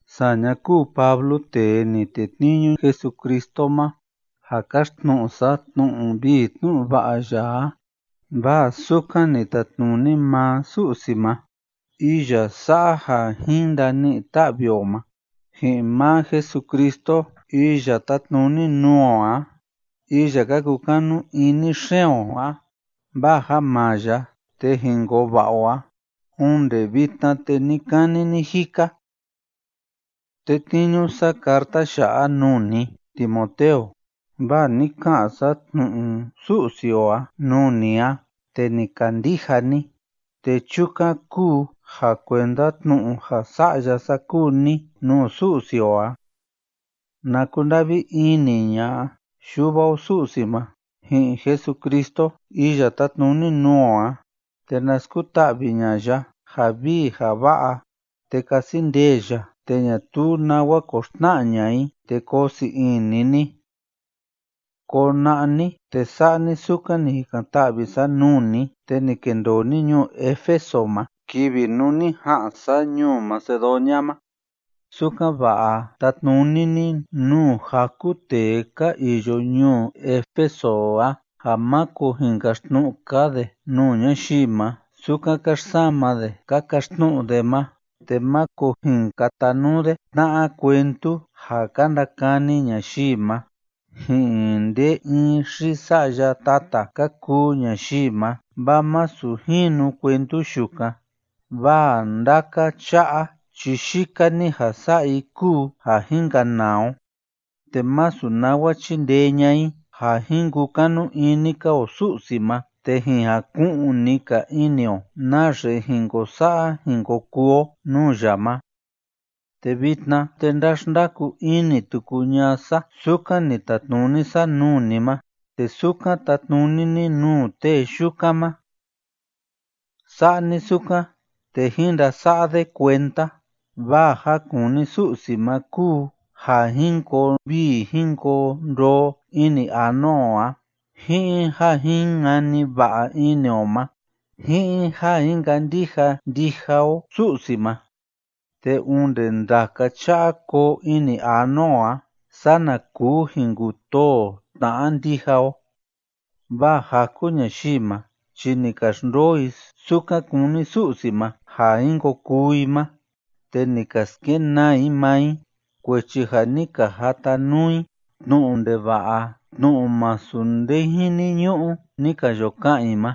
Saña kúu Pablo tee ni tetniñu Jesucristo ma ja kaxtnu'u sa tnu'u vii tnu'u va'a ya a, vaa sukan ni tatnuni maa Su'si ma, iya sa'a ja jin ndani'i ta'vi o ma, ji'in maa Jesucristo iya tátnuni nuu o a iya ka kukanu ini xeen o a, vaa ja maa ya, te jin koo va'a o a onde vitna te ni‑kani ni‑jika. Tétniñu sa carta ya'a nuu ni, Timoteo, vaa ni ka'an sa tnu'u Su'si o a nuu ni a, te ni kandija ni, te chukan kúu ja kuenda tnu'u ja sa'ya sa kúu ni nuu Su'si o a. Na kunda'vi ini ña'a Yuva o Su'si ma, ji'in Jesucristo iya tátnuni nuu o a, te na skuta'vi ña'a ya ja vii ja va'a, te kási ndee ya, te ñatuu nawa ko xtna'a ña'a i, te koo sii ini ni. Kona'a ni te sa'a ni sukan ni jikan‑ta'vi sa nuu ni, te ni kendoo ni ñuu Éfeso ma, kivi nuu ni ja'an sa ñuu Macedonia ma, sukan‑va'a tatnuni ni nuu jaku tee ka iyo ñuu Éfeso a, ja máko jin kaxtnu'u‑ka de nuu ñayii ma sukan ka xsama de ka kaxtnu'u de ma, te máko jin katanuu de tna'a cuentu ja ka ndakani ñayii ma, ji'in nde in xi‑sa'ya tata ka kuu ñayii ma, vaa masu jinu cuentu yukan. Vaa ndaka cha'a chi yika‑ni ja sa'a i kúu ja jin kanaa o, te masu nawa chíndee ña'a i ja jin kukanu ini‑ka o Su'si ma te jin jaku'ni‑ka ini o naxe jin ko sa'a jin ko kuu o nuu ya ma. Te vitna, te ndáxndaku ini tuku ña'a sa sukan ni tatnuni sa nuu ni ma, te sukan tatnuni ni nuu tee yukan ma. Sa'a ni sukan, te jin ndasa'a de kuenda, vaa ja kúni Su'si ma kúu ja jin koo vii jin koo ndoo ini anua o a ji'in ja jin kani va'a ini o ma ji'in ja jin kandija ndija o Su'si ma, te onde ndaka cha'a koo ini anua o a sana kuu jin kutoo tna'a ndija o. Vaa jaku ñayii ma chi ni ka xndoo i sukan kúni Su'si ma ja jin ko kuu i ma, te ni ka skenaa i maa i, kuechi ja ni ka jatanuu i tnu'u ndeva'a tnu'u masu nde jiniñu'u ni ka yo ka'an i ma.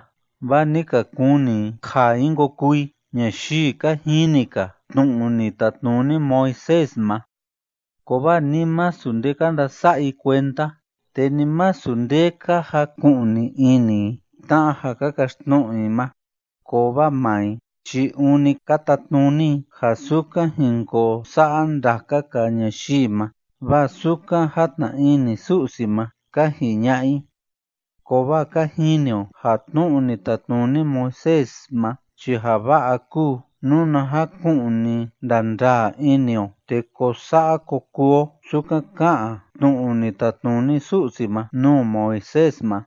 Vaa ni ka kuni i ja jin ko kuu i ñayii ka jini‑ka tnu'u ni tatnuni Moisés ma, kovaa ni masu nde ka ndasa'a i kuenda, te ni masu nde ka jaku'ni ini i tna'a ja ka kaxtnu'u i ma, kovaa maa i chi ûni ka tatnuni i ja sukan jin ko sa'a ndaka‑ka ñayii ma, vaa sukan játna ini Su'si ma, ka jiña'a i. Kovaa ka jini o ja tnu'u ni tatnuni Moisés ma chi ja va'a kúu, nuna jaku'ni ndandaa ini o te ko sa'a ko kuu o sukan ká'an tnu'u ni tatnuni Su'si ma nuu Moisés ma.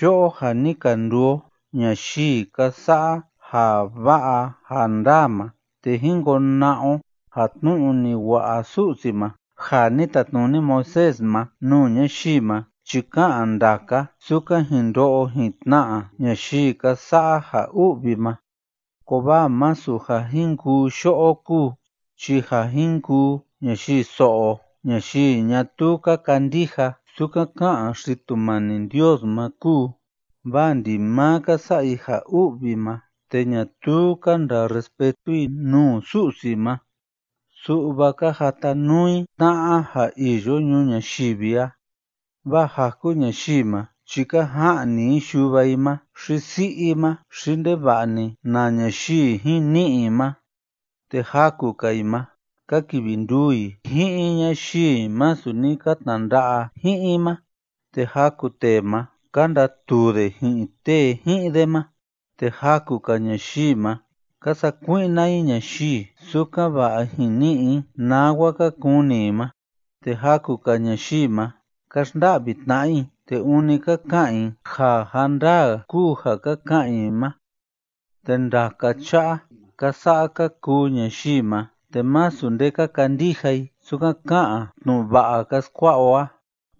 Yo'o ja ni ka nduu o ñayii ka sa'a ja va'a ja ndaa ma, te jín kona'a o ja tnu'u ni wa'a Su'si ma ja ni tatnuni Moisés ma nuu ñayii ma chi ká'an ndaka sukan jin ndo'o jin tna'a ñayii ka sa'a ja u'vi ma, kovaa masu ja jin kuu yo'o kúu chi ja jin kuu ñayii so'o ñayii ñatuu ka kandija sukan ká'an Xtumani Ndios ma kúu. Vaa ndimaa ka sa'a i ja u'vi ma, te ñatuu ka ndaa respetu i nuu Su'si ma, su'va ka jatanuu i tna'a ja iyo ñuu ñayivi a. Vaa jaku ñayii ma chi ka ja'ni i yuva i ma xi si'i i ma xi ndeva'a‑ni na ñayii jin ni'i i ma. Te jaku‑ka i ma, ka kivi nduu i ji'in ñayii masu ni ka tnanda'a ji'in i ma, te jaku tee ma, ka ndatuu de ji'in tee ji'in de ma. Te jaku‑ka ñayii ma, ka sakui'na i ñayii sukan‑va'a jin ni'i i nawa ka kuni i ma, te jaku‑ka ñayii ma, ka xnda'vi tna'a i, te ûni ka ka'an i ja ja ndaa kúu ja ka ka'an i ma. Te ndaka cha'a ka sa'a ka kuu ñayii ma, te masu nde ka kandija i sukan ká'an tnu'u va'a ka skua'a o a,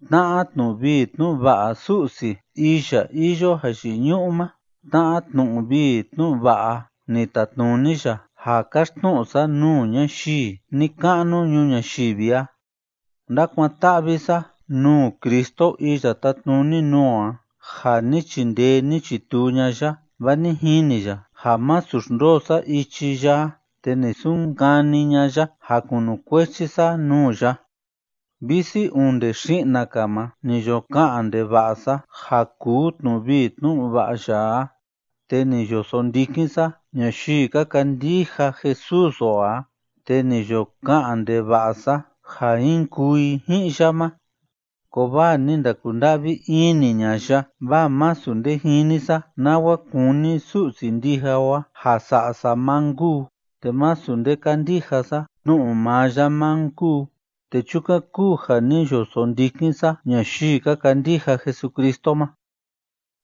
tna'a tnu'u vii tnu'u va'a Su'si iya iyo jayiñu'u ma, tna'a tnu'u vii tnu'u va'a ni tatnuni ya ja kaxtnu'u sa nuu ñayii ni‑ka'nu ñuu ñayivi a. Ndakuan‑ta'vi sa nuu Cristo iya tátnuni nuu o a ja ni chindee ni chituu ña'a ya, vaa ni jini ya ja masu xndoo sa ichi ya a, te ni sunkani ña'a ya ja kunukuechi sa nuu ya, visi onde xi'na‑ka ma ni yo ka'an ndeva'a sa ja kuu tnu'u vii tnu'u va'a ya a, te ni yo sondikin sa ñayii ka kandija Jesús o a, te ni yo ka'an ndeva'a sa ja jin kuu i ji'in ya ma. Kovaa ni ndakunda'vi ini ña'a ya, vaa masu nde jini sa nawa kúni Su'si ndija o a ja sa'a sa ma nkuu, te masu nde kándija sa tnu'u maa ya ma nkuu, te chukan kúu ja ni yo sondikin sa ñayii ka kandija Jesucristo ma.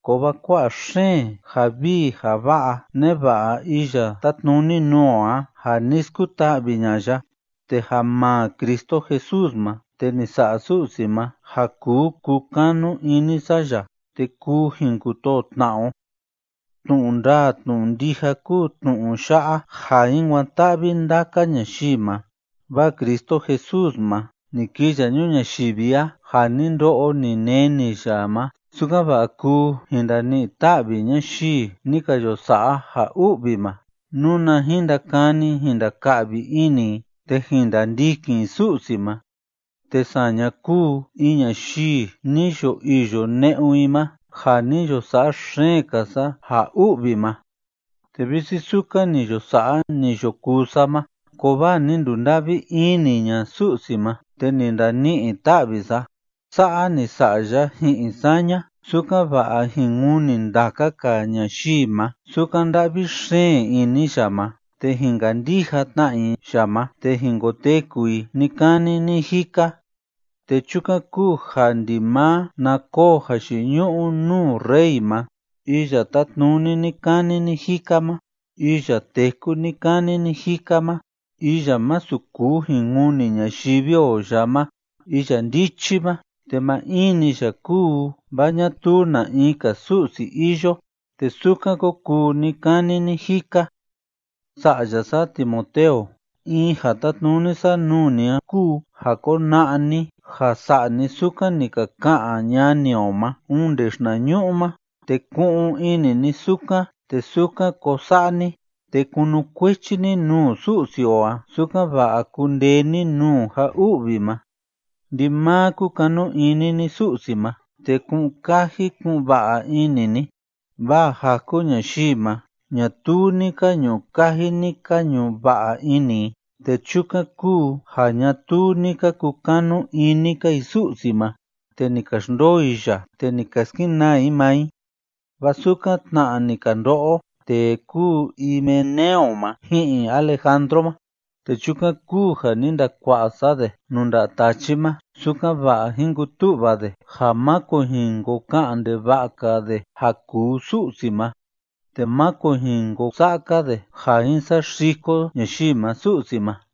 Kovaa kua'a xeen ja vii ja va'a neva'a iya tátnuni nuu o a ja ni skuta'vi ña'a ya, te ja maa Cristo Jesús ma, te ni sa'a Su'si ma ja kuu kukanu ini sa ya te kuu jin kutoo tna'a o. Tnu'u ndaa tnu'u ndija kúu tnu'u ya'a ja jin kuan‑ta'vi ndaka ñayii ma: Vaa Cristo Jesús ma, ni kii ya ñuu ñayivi a ja ni ndo'o ni neni ya ma, sukan‑va'a kuu jin ndani'i ta'vi ñayii ni ka yo sa'a ja u'vi ma, nuna jin ndakani jin ndaka'vi ini i te jin ndandikin i Su'si ma. Te saña kúu in ñayii ni yo iyo ne'un i ma ja ni yo sa'a xeen‑ka sa ja u'vi ma. Te visi sukan ni yo sa'a, ni yo kuu sa ma, kovaa ni ndunda'vi ini ña'a Su'si ma, te ni ndani'i ta'vi sa. Sa'a ni sa'a ya ji'in saña, sukan‑va'a jin kuni ndaka‑ka ñayii ma sukan nda'vi xeen ini ya ma, te jin kandija tna i ya ma, te jin koteku i ni‑kani ni‑jika. Te chukan kúu ja ndimaa na koo jayiñu'u nuu Rey ma, iya tátnuni ni‑kani ni‑jika ma, iya téku ni‑kani ni‑jika ma, iya masu kuu jin kuni ñayivi o ya ma, iya ndichi ma, te maa in‑ni ya kúu, vaa ñatuu na in‑ka Su'si iyo. Te sukan kó kuu ni‑kani ni‑jika. Sa'ya sa Timoteo, in ja tátnuni sa nuu ni a kúu ja kona'a ni ja sa'a ni sukan ni ka ka'an ñani o ma onde xinañu'u ma. Te ku'un ini ni sukan, te sukan ko sa'a ni, te kunukuechi ni nuu Su'si o a, sukan‑va'a kundee ni nuu ja u'vi ma. Ndimaa kukanu ini ni Su'si ma, te ku'un kaji ku'un va'a ini ni. Vaa jaku ñayii ma, ñatuu ni ka ñu'u kaji, ni ka ñu'u va'a ini i, te chukan kúu ja ñatuu ni ka kukanu ini‑ka i Su'si ma, te ni ka xndoo i ya, te ni ka skenaa i maa i. Vaa sukan tna ni ka ndo'o tee kúu Himeneo ma ji'in Alejandro ma. Te chukan kúu ja ni ndakua'a sa de nuu nda'a tachi ma, sukan‑va'a jin kutu'va de ja máko jin ko ka'an ndeva'a‑ka de ja kuu Su'si ma, te máko jin ko sa'a‑ka de ja jin saxiko ñayii ma Su'si ma.